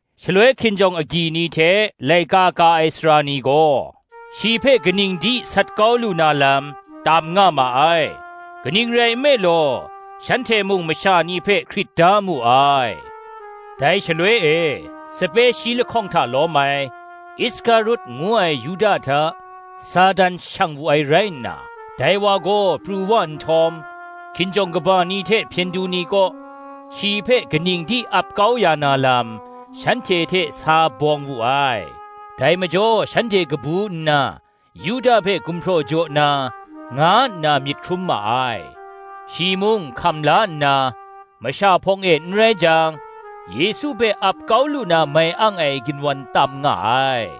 Shaloi hkinjawng agyi ni hte laika ka ai sara ni gaw, shi hpe kaning di sat kau lu na lam, tam nga ma ai: kaning rai nme law, shanhte mung masha ni hpe hkrit da mu ai. Dai shaloi e, sape shi lahkawng hta lawm ai, Iskarut ngu ai Yuda hta, Satan shang wu ai rai nna, dai wa gaw pru wa nhtawm, hkinjawng kaba ni hte hpyen du ni kaw, shi hpe kaning di ap kau ya na lam, shanhte hte sa bawng wu ai. Dai majaw shanhte kabu nna, Yuda hpe gumhpraw jaw na, nga nna myit hkrum ma ai. Shi mung hkam la nna, masha hpawng e n rai jang, Yesu hpe ap kau lu na mai ang ai ginwan tam nga ai.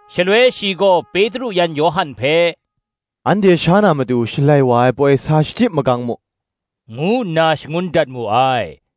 Shaloi shi gaw Petru yan Yawhan hpe, “Anhte sha na matu Shalai wa ai poi sa shachyip magang mu,” ngu nna shangun dat mu ai.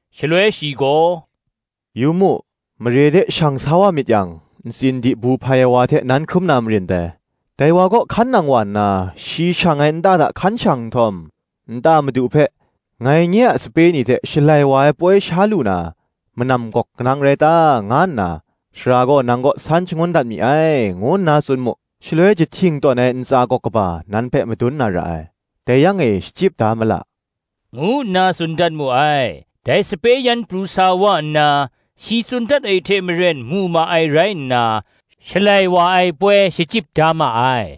Shaloi shi gaw, “Yu mu, mare de shang sa wa myit yang, ntsin dibu hpai ai wa hte nan hkrum na marin dai: dai wa kaw hkan nang wa nna, shi shang ai nta hta hkan shang nhtawm, nta madu hpe, ‘Ngai nye a sape ni hte Shalai wa ai poi sha lu na manam gawk kanang rai ta?’ nga nna Sara gaw nang kaw san shangun dat mi ai, ngu nna tsun mu. Shaloi jahting tawn ai ntsa gawk kaba nan hpe madun na ra ai: dai yang e shachyip da ma la,” ngu nna tsun dat mu ai. Dai sape yan pru sa wa nna, shi tsun dat ai hte maren mu ma ai rai nna, Shalai wa ai poi shachyip da ma ai.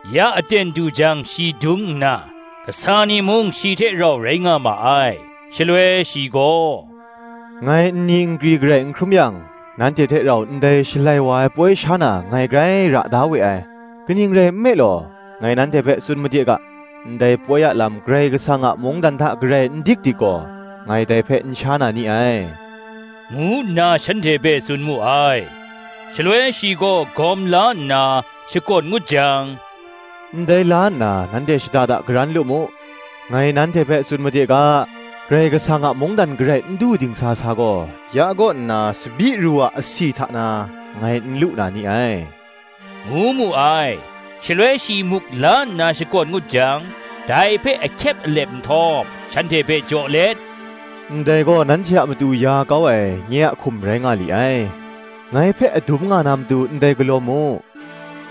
Ya aten du jang shi dung nna, kasa ni mung shi hte rau rai nga ma ai. Shaloi shi gaw, “Ngai nni nkri garai n hkrum yang, nanhte hte rau ndai Shalai wa ai poi sha na, ngai grai ra da we ai: kaning rai nme law, ngai nanhte hpe tsun made ga, Ndai poi a lam Karai Kasang a mungdan hta garai n dik dik gaw, ngai dai hpe n sha na ni ai,” ngu nna shanhte hpe tsun mu ai. Shaloi shi gaw gawm la nna, shakawn ngut jang, “Ndai la nna nanhte shada karan lu mu: ngai nanhte hpe tsun made ga, Karai Kasang a mungdan garai n du dingsa sa gaw, ya kaw nna tsabyi ru a asi hta na, ngai n lu na ni ai,” ngu mu ai. Shaloi shi muk la nna shakawn ngut jang, dai hpe ahkyep alep nhtawm, shanhte hpe jaw let, “Ndai gaw nanhte a matu ya kau ai, nye a hkum rai nga li ai: ngai hpe adum nga na matu, ndai galaw mu,”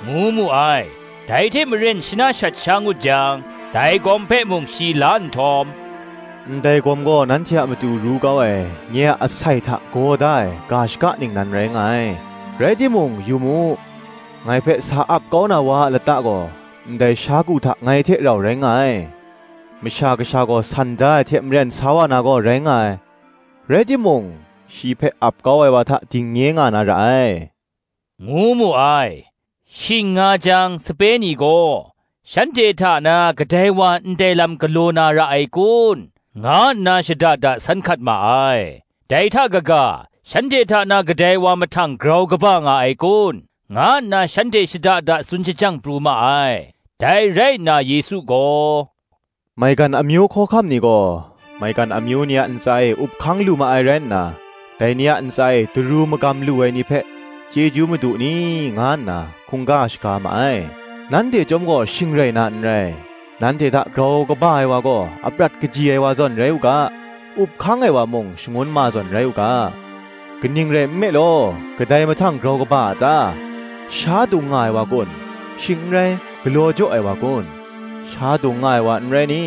ngu mu ai. Dai hte maren shana shat sha ngut jang, dai gawm hpe mung shi la nhtawm, “Ndai gawm gaw nanhte a matu ru kau ai, nye a asai hta gaw da ai, ga shaka ningnan rai nga ai. Rai timung, yu mu, ngai hpe sa ap kau na wa a lata gaw, ndai sha ku hta ngai hte rau rai nga ai: Masha Kasha gaw, san da ai hte maren sa wa na gaw, rai nga ai: rai timung, shi hpe ap kau ai wa hta dingnye nga na ra ai,” ngu mu ai. Shing nga jang sape ni gaw, shanhte hta na kadai wa ndai lam galaw na ra ai kun, nga nna shada da san hkat ma ai. Dai hta kaga, shanhte hta na kadai wa mahtang grau kaba nga ai kun, nga nna shanhte shada da tsun shajang pru ma ai. Dai rai nna Yesu gaw, “Maigan amyu hkawhkam ni gaw, maigan amyu ni a ntsa e up hkang lu ma ai rai nna, dai ni a ntsa e daru magam lu ai ni hpe, Chyeju madu ni, nga nna hkungga shaga ma ai. Nanhte chyawm gaw shing rai na n rai: nanhte hta, grau kaba ai wa gaw, aprat kaji ai wa zawn rai u ga; up hkang ai wa mung, shangun ma zawn rai u ga. Kaning rai nme law, kadai mahtang grau kaba a ta? sha dung nga ai wa kun? shing n rai, galaw jaw ai wa kun? sha dung nga ai wa, n rai ni?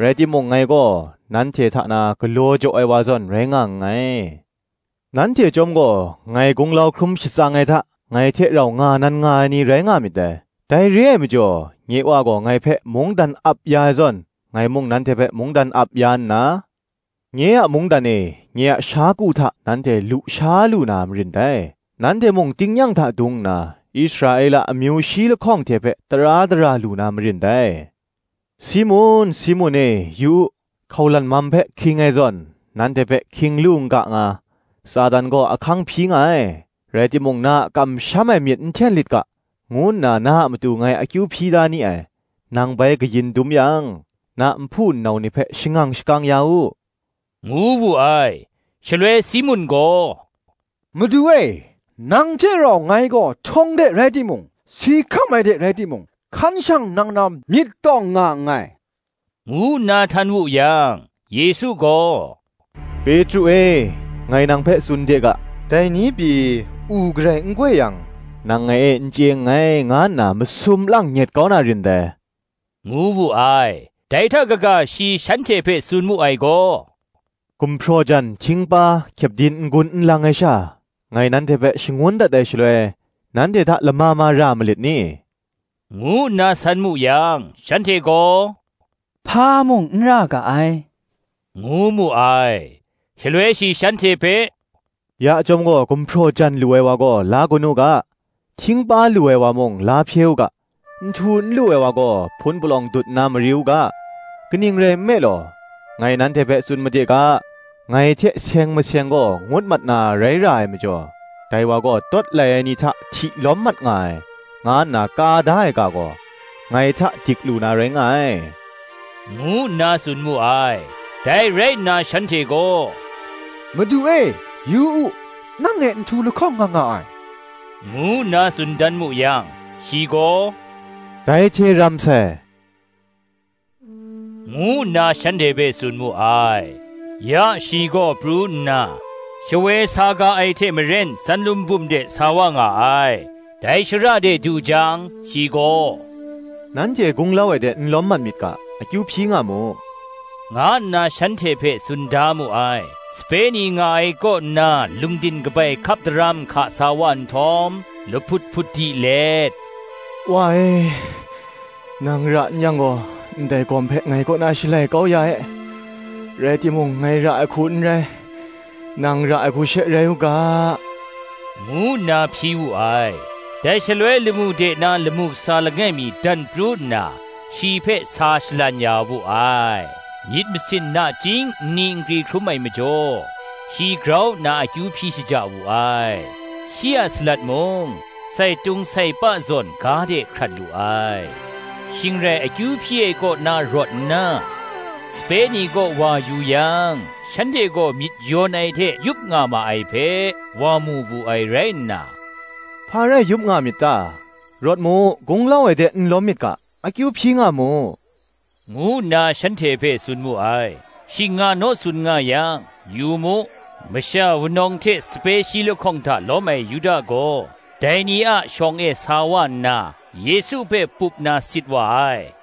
Rai timung ngai gaw, nanhte hta na galaw jaw ai wa zawn rai nga nngai. Nanhte chyawm gaw, ngai gunglau hkrum shatsang ai hta, ngai hte rau nga nan nga ai ni, rai nga myit dai. Dai re ai majaw, nye wa gaw ngai hpe mungdan ap ya ai zawn, ngai mung nanhte hpe mungdan ap ya nna, nye a mungdan e, nye a sha ku hta, nanhte lu sha lu na marin dai: nanhte mung tingnyang hta dung nna, Israela amyu shi lahkawng hte hpe tara dara lu na marin dai. Simun, Simun e, yu u, hkaulan mam hpe hking ai zawn, nanhte hpe hking lu n ga nga, Satan gaw ahkang hpyi nga ai: rai timung na a kamsham ai myit n hten lit ga, ngu nna na a matu ngai akyu hpyi da ni ai; nang bai kayin dum yang, na nhpu nnau ni hpe shangang shakang ya u,” ngu wu ai. Shaloi Simun gaw, “Madu e, nang hte rau ngai gaw htawng de rai timung, si hkam ai de rai timung, hkan shang nang na myit tawng nga nngai,” ngu nna htan wu yang, Yesu gaw, “Petru e, ngai nang hpe tsun de ga, Dai ni pyi, u garai n goi yang, nang ngai e n chye nngai, nga nna masum lang nyet kau na rin dai,” ngu wu ai. Dai hta kaga shi shanhte hpe tsun mu ai gaw, “Gumhpraw jan, htingpa, kyepdin n gun n lang ai sha, ngai nanhte hpe shangun dat ai shaloi, nanhte hta lama ma ra malit ni?” ngu nna san mu yang, shanhte gaw, “Hpa mung n ra ga ai,” ngu mu ai. Shaloi shi shanhte hpe, “Ya chyawm gaw gumhpraw jan lu ai wa gaw, la gun u ga; htingpa lu ai wa mung, la hpye u ga; nhtu n lu ai wa gaw, hpun palawng dut nna mari u ga: kaning rai nme law, ngai nanhte hpe tsun made ga, ngai hte seng maseng gaw ngut mat na rai ra ai majaw, ‘Dai wa gaw tawt lai ai ni hta hti lawm mat nga ai,’ nga nna ka da ai ga gaw, ngai hta dik lu na rai nga ai,” ngu nna tsun mu ai. Dai rai nna shanhte gaw, “Madu e, yu u, nang e nhtu lahkawng nga nga ai,” ngu nna tsun dan mu yang, shi gaw, “Dai hte ram sai,” ngu nna shanhte hpe tsun mu ai. Ya shi gaw pru nna, shawoi sa ga ai hte maren Tsanlun bum de sa wa nga ai. Dai shara de du jang, shi gaw, “Nanhte gunglau ai de n lawm mat myit ga, akyu hpyi nga mu,” nga nna shanhte hpe tsun da mu ai; sape ni nga ai kaw nna lungdin kabai hkap daram hka sa wa nhtawm, lahput hput di let, “Wa e, nang ra n yang gaw, ndai gawm hpe ngai kaw na shalai kau ya e; rai timung ngai ra ai hku n rai, nang ra ai hku she rai u ga,” ngu nna hpyi wu ai. (Dai shaloi lamu de na lamu kasa langai mi dan pru nna, shi hpe sa shalan ya wu ai. Myit masin nachying nni nkri hkrum ai majaw, shi grau nna akyu hpyi shaja wu ai: shi a salat mung, sai tum sai pa zawn ga de hkrat lu ai.) Shing rai akyu hpyi ai kaw na rawt nna, sape ni kaw wa yu yang, shanhte gaw myit yawn ai hte yup nga ma ai hpe, wa mu wu ai rai nna, “Hpa rai yup nga myit ta? rawt mu, gunglau ai de n lawm myit ga akyu hpyi nga mu,” ngu nna shanhte hpe tsun mu ai. Shing nga naw tsun nga yang, yu mu, masha wunawng hte sape shi lahkawng hta lawm ai Yuda gaw, dai ni a shawng e sa wa nna, Yesu hpe pup na sit wa ai.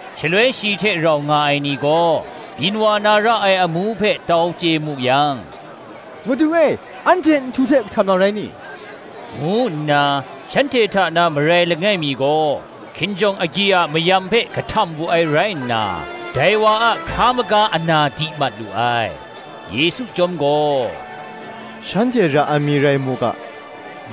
Shaloi shi hte rau nga ai ni gaw, byin wa na ra ai amu hpe tau chye mu yang, “Madu e, anhte nhtu hte kahtam na rai ni?” ngu nna, shanhte hta na marai langai mi gaw, hkinjawng agyi a mayam hpe kahtam wu ai rai nna, dai wa a hkra maga ana di mat lu ai. Yesu chyawm gaw, “Shanhte ra ai mi rai mu ga,”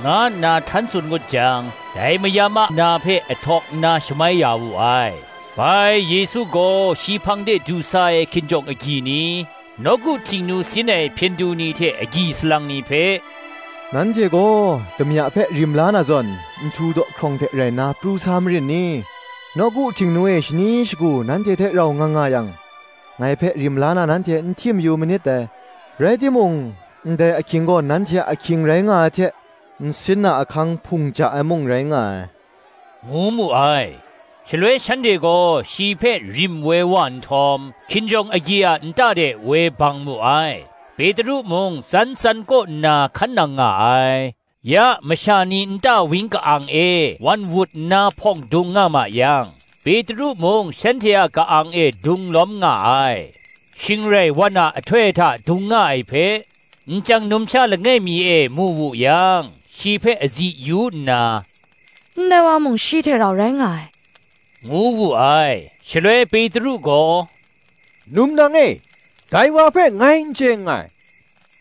nga nna htan tsun ngut jang, dai mayam a na hpe ahtawk nna shamai ya wu ai. Bai Yesu gaw shi hpang de du sa ai hkinjawng agyi ni, nawku Htingnu sin ai hpyen du ni hte agyi salang ni hpe, “Nanhte gaw damya hpe rim la na zawn, nhtu dawhkrawng hte rai nna pru sa marin ni? Nawku Htingnu e shani shagu nanhte hte rau nga nga yang, ngai hpe rim la na nanhte n htim yu manit dai; rai timung, ndai ahkying gaw nanhte a ahkying rai nga ai hte, nsin a ahkang hpung ja ai mung rai nga ai,” ngu mu ai. Shaloi shanhte gaw shi hpe rim woi wa nhtawm, hkinjawng agyi a nta de woi bang mu ai: Petru mung tsan tsan kaw nna hkan nang nga ai. Ya masha ni nta wang ka-ang e wan wut nna hpawng dung nga ma yang, Petru mung shanhte a ka-ang e dung lawm nga ai. Shing rai wan a ahtoi hta dung nga ai hpe, nchyang numsha langai mi e mu wu yang, shi hpe azi yu nna, “Ndai wa mung shi hte rau rai nga ai,” ngu wu ai. Shaloi Petru gaw, “Num nang e, dai wa hpe ngai n chye nngai,”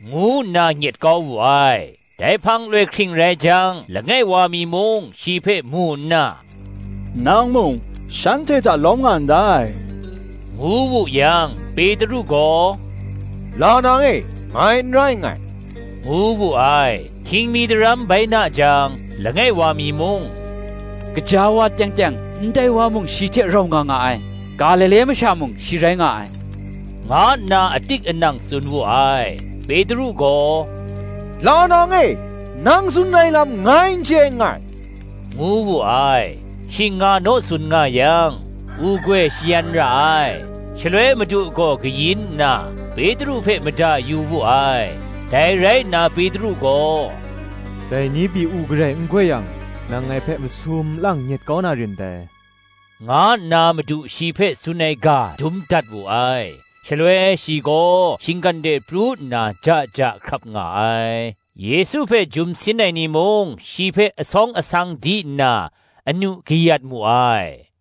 ngu nna nyet kau wu ai. Dai hpang loi hkring rai jang langai wa mi mung shi hpe mu nna, “Nang mung shanhte hta lawm nga ndai,” ngu wu yang, Petru gaw, “La nang e, ngai n rai nngai,” ngu wu ai. Hkying mi daram bai na jang, langai wa mi mung, “Gaja wa teng teng, ndai wa mung shi hte rau nga nga ai; Galile masha mung shi rai nga ai,” nga nna atik anang tsun wu ai: Petru gaw, “La nang e, nang tsun ai lam ngai n chye nngai,” ngu wu ai. Shing nga naw tsun nga yang, u goi shayan ra ai. Shaloi Madu gaw kayin nna, Petru hpe mada yu wu ai. Dai rai nna Petru gaw, “Dai ni pyi, u garai n goi yang, nang ngai hpe masum lang nyet kau na rin dai,” nga nna Madu shi hpe tsun ai ga dum dat wu ai: shaloi shi gaw shinggan de pru nna ja ja hkrap nga ai. Yesu hpe jum sin ai ni mung shi hpe asawng asang di nna, anu kayat mu ai: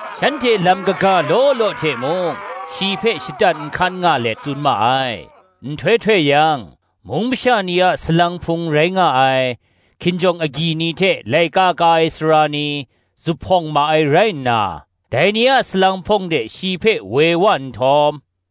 Shanhte lam kaga law law hte mung, shi hpe shatan nhkan nga let tsun ma ai. Nhtoi htoi yang, mung masha ni a salang hpung rai nga ai, hkinjawng agyi ni hte laika ka ai sara ni, zuphpawng ma ai rai nna, dai ni a salang hpawng de shi hpe woi wa nhtawm,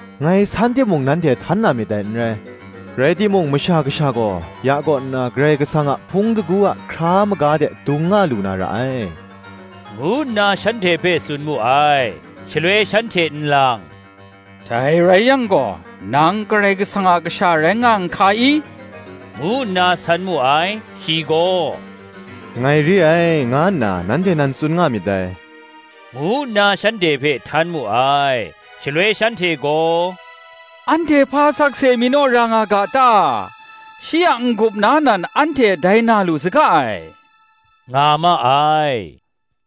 ngai san timung, nanhte htan na myit dai n rai. Rai timung Masha Kasha gaw, ya kaw nna Karai Kasang a hpung shingkang a hkra maga de dung nga lu na ra ai,” ngu nna shanhte hpe tsun mu ai. Shaloi shanhte nlang, “Dai rai yang gaw, nang Karai Kasang a kasha rai nga n hka i?” ngu nna san mu ai; shi gaw, “Ngai re ai, nga nna nanhte nan tsun nga myit dai,” ngu nna shanhte hpe htan mu ai. Shaloi shanhte gaw, “Anhte hpa sakse mi naw ra nga ga ta? shi a n-gup na nan anhte dai na lu saga ai,” nga ma ai.